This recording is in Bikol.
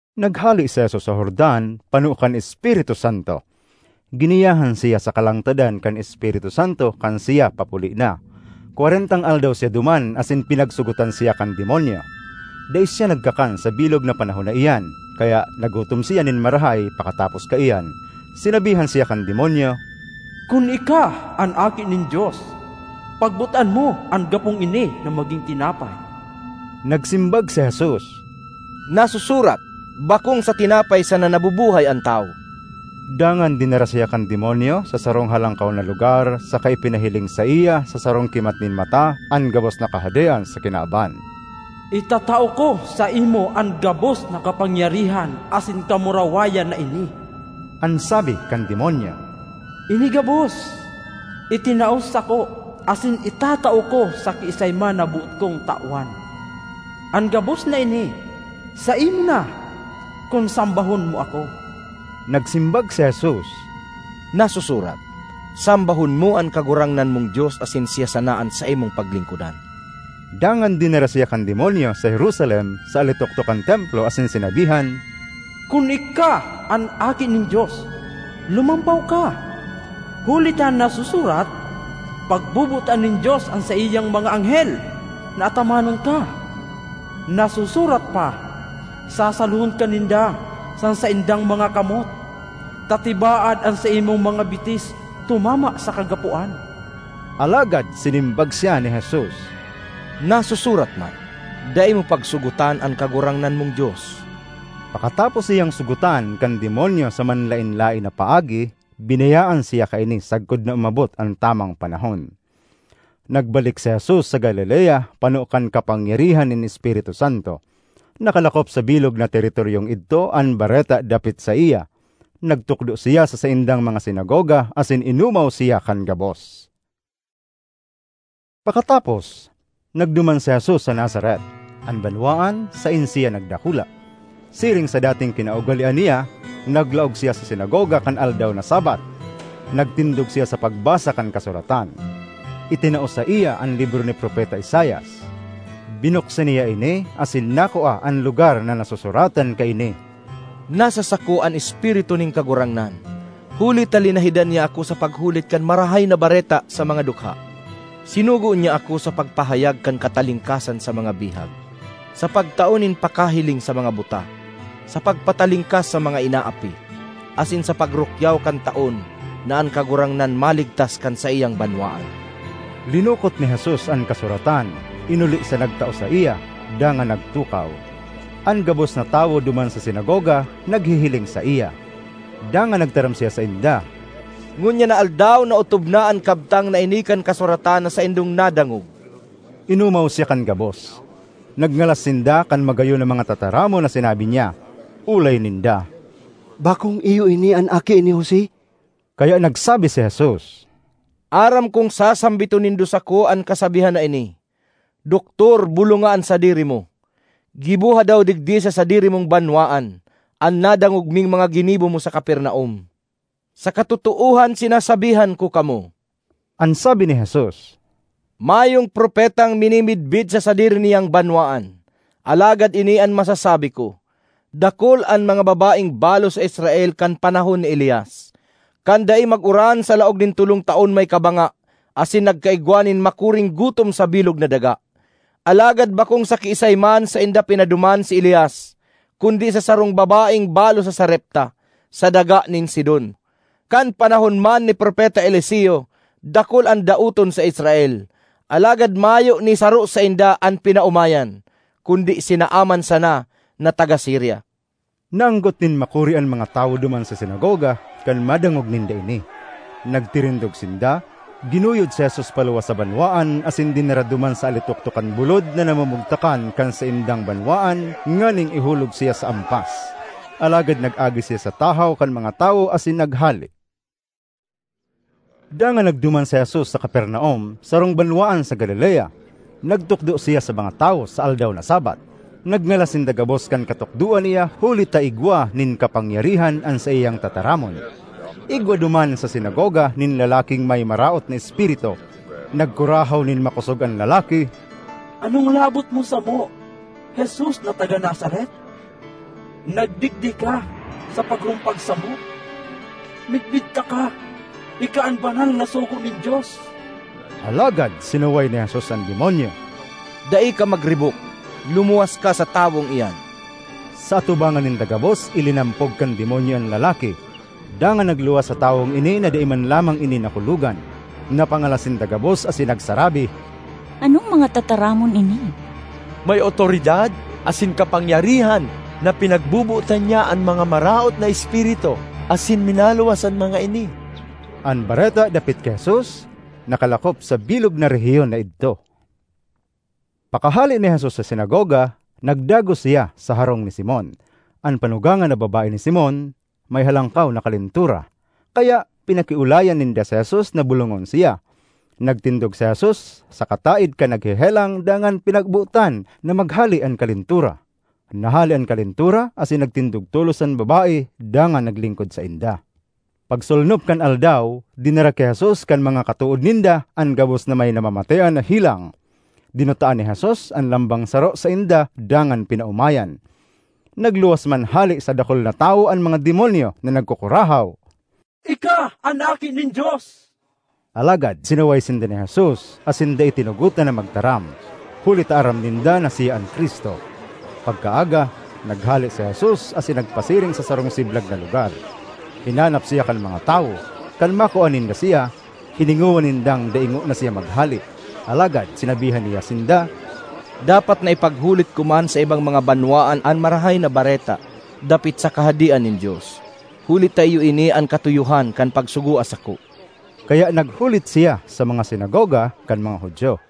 Naghale si Jesus sa Jordan, pano kan Espiritu Santo; giniyahan siya sa kalangtadan kan Espiritu Santo kan siya papuli na. Kwarentang aldaw siya duman asin pinagsogotan siya kan demonyo. Dai siya nagkakan sa bilog na panahon na iyan, kaya nagutom siya nin marahay pakatapos kaiyan. Sinabihan siya kan demonyo, “Kun ika an Aki nin Dios, pagbotan mo an gapong ini na magin tinapay.” Nagsimbag si Jesus, “Nasusurat, ‘Bakong sa tinapay sana nabubuhay an tawo.’” Dangan dinara siya kan demonyo sa sarong halangkaw na lugar saka ipinahiling saiya sa sarong kimat nin mata an gabos na kahadean sa kinaban. ”Itatao ko saimo an gabos na kapangyarihan asin kamurawayan na ini,” an sabi kan demonyo. “Ini gabos itinao sako asin itatao ko sa kiisay man na boot kong tawan. An gabos na ini saimo na, kun sambahon mo ako.” Nagsimbag si Jesus, “Nasusurat, ‘Sambahon mo an Kagurangnan mong Dios asin siya sana an saimong paglingkodan!’” Dangan dinara siya kan demonyo sa Jerusalem, sa alitoktok kan Templo, asin sinabihan, “Kun ika an Aki nin Dios, lumampaw ka, huli ta nasusurat, ‘Pagbobotan nin Dios an saiyang mga anghel na atamanon ka.’ Nasusurat pa, ‘Sasalohon ka ninda sa saindang mga kamot, ta tibaad an saimong mga bitis tumama sa kagapoan.’” Alagad sinimbag siya ni Jesus, “Nasusurat man, ‘Dai mo pagsugotan an Kagurangnan mong Dios.’” Pakatapos siyang sogotan kan demonyo sa manlaen-laen na paagi, binayaan siya kaini sagkod na umabot an tamang panahon. Nagbalik si Jesus sa Galilea pano kan kapangyarihan nin Espiritu Santo. Nakalakop sa bilog na teritoryong idto an bareta dapit saiya. Nagtukdo siya sa saindang mga sinagoga asin inomaw siya kan gabos. Pakatapos, nagduman si Jesus sa Nazaret, an banwaan saen siya nagdakula. Siring sa dating kinaugalean niya, naglaog siya sa sinagoga kan aldaw na Sabbath. Nagtindog siya sa pagbasa kan Kasuratan. Itinao saiya an libro ni Propeta Isaias. Binuksan niya ini asin nakua an lugar na nasusuratan kaini, ”Nasa sako an Espiritu nin Kagurangnan, huli ta linahidan niya ako sa paghulit kan Marahay na Bareta sa mga dukha. Sinugo niya ako sa pagpahayag kan katalingkasan sa mga bihag, sa pagtao nin pakahiling sa mga buta, sa pagpatalingkas sa mga inaapi, asin sa pagrukyaw kan taon na an Kagurangnan maligtas kan saiyang banwaan!” Linukot ni Jesus an kasuratan, inuli sa nagtao saiya, dangan nagtukaw. An gabos na tawo duman sa sinagoga naghihiling saiya. Dangan nagtaram siya sainda, “Ngunyan na aldaw naotob na an kabtang na ini kan kasuratan na saindong nadangog.” Inomaw siya kan gabos; nagngalas sinda kan magayon na mga tataramon na sinabi niya. Olay ninda, “Bakong iyo ini an aki ni Jose?” Kaya nagsabi si Jesus, “Aram kong sasambiton nindo sako an kasabihan na ini, ‘Doktor, bolonga an sadiri mo. Giboha daw digdi sa sadiri mong banwaan an nadangog ming mga ginibo mo sa Capernaum.’ Sa katotoohan sinasabihan ko kamo,” an sabi ni Jesus, “mayong propetang minimidbid sa sadiri niyang banwaan. Alagad ini an masasabi ko: dakul an mga babaeng balo sa Israel kan panahon ni Elias, kan dai mag-uran sa laog nin tolong taon may kabanga asin nagkaigwa nin makuring gutom sa bilog na daga. Alagad bakong sa kiisay man sainda pinaduman si Elias kundi sa sarong babaeng balo sa Sarepta, sa daga nin Sidon. Kan panahon man ni Propeta Eliseo, dakul an daoton sa Israel; alagad mayo ni saro sainda an pinaomayan, kundi si Naaman sana na taga Siria.” Naanggot nin makuri an mga tawo duman sa sinagoga kan madangog ninda ini. Nagtirindog sinda, ginuyod si Jesus paluwas sa banwaan asin dinara duman sa alitoktok kan bulod na namumugtakan kan saindang banwaan nganing ihulog siya sa ampas. Alagad nag-agi siya sa tahaw kan mga tawo asin naghale. Dangan nagduman si Jesus sa Capernaum, sarong banwaan sa Galilea. Nagtukdo siya sa mga tawo sa aldaw na Sabbath. Nagngalas sinda gabos kan katukdoan niya huli ta igwa nin kapangyarihan an saiyang tataramon. Igwa duman sa sinagoga nin lalaking may maraot na espiritu. Nagkurahaw nin makosog an lalaki, ”Anong labot mo samo, Jesus na taga Nazaret? Nagdigdi ka sa pagrumpag samo? Midbid taka—ika an banal na sugo nin Dios!” Alagad sinaway ni Jesus an demonyo, “Dai ka magribok! Lumuwas ka sa tawong iyan!” Sa atubangan ninda gabos ilinampog kan demonyo an lalaki, dangan nagluwas sa tawong ini na dai man lamang ini nakulogan. Napangalas sinda gabos asin nagsarabi, “Anong mga tataramon ini? May awtoridad asin kapangyarihan na pinagbobotan niya an mga maraot na espiritu asin minaluwas an mga ini!” An bareta dapit ki Jesus nakalakop sa bilog na rehiyon na idto. Pakahale ni Jesus sa sinagoga, nagdagos siya sa harong ni Simon. An panugangan na babae ni Simon may halangkaw na kalentura, kaya pinakiolayan ninda si Jesus na bolongon siya. Nagtindog si Jesus sa kataed kan naghehelang dangan pinagbotan na maghale an kalentura. Nahale an kalentura asin nagtindog tolos an babae dangan naglingkod sainda. Pagsolnop kan aldaw, dinara ki Jesus kan mga katood ninda an gabos na may namamatean na helang. Dinutaan ni Jesus an lambang saro sainda dangan pinaomayan. Nagluwas man hale sa dakul na tawo an mga demonyo na nagkukurahaw, “Ika an Aki nin Dios!” Alagad sinaway sinda ni Jesus asin dai tinugotan na magtaram, huli ta aram ninda na siya an Cristo. Pagkaaga, naghale si Jesus asin nagpasiring sa sarong siblag na lugar. Hinanap siya kan mga tawo; kan makua ninda siya, hiningowa nindang dai ngona siya maghale. Alagad sinabihan niya sinda, “Dapat na ipaghulit ko man sa ibang mga banwaan an Marahay na Bareta dapit sa Kahadean nin Dios, huli ta iyo ini an katuyohan kan pagsugoa sako.” Kaya naghulit siya sa mga sinagoga kan mga Judio.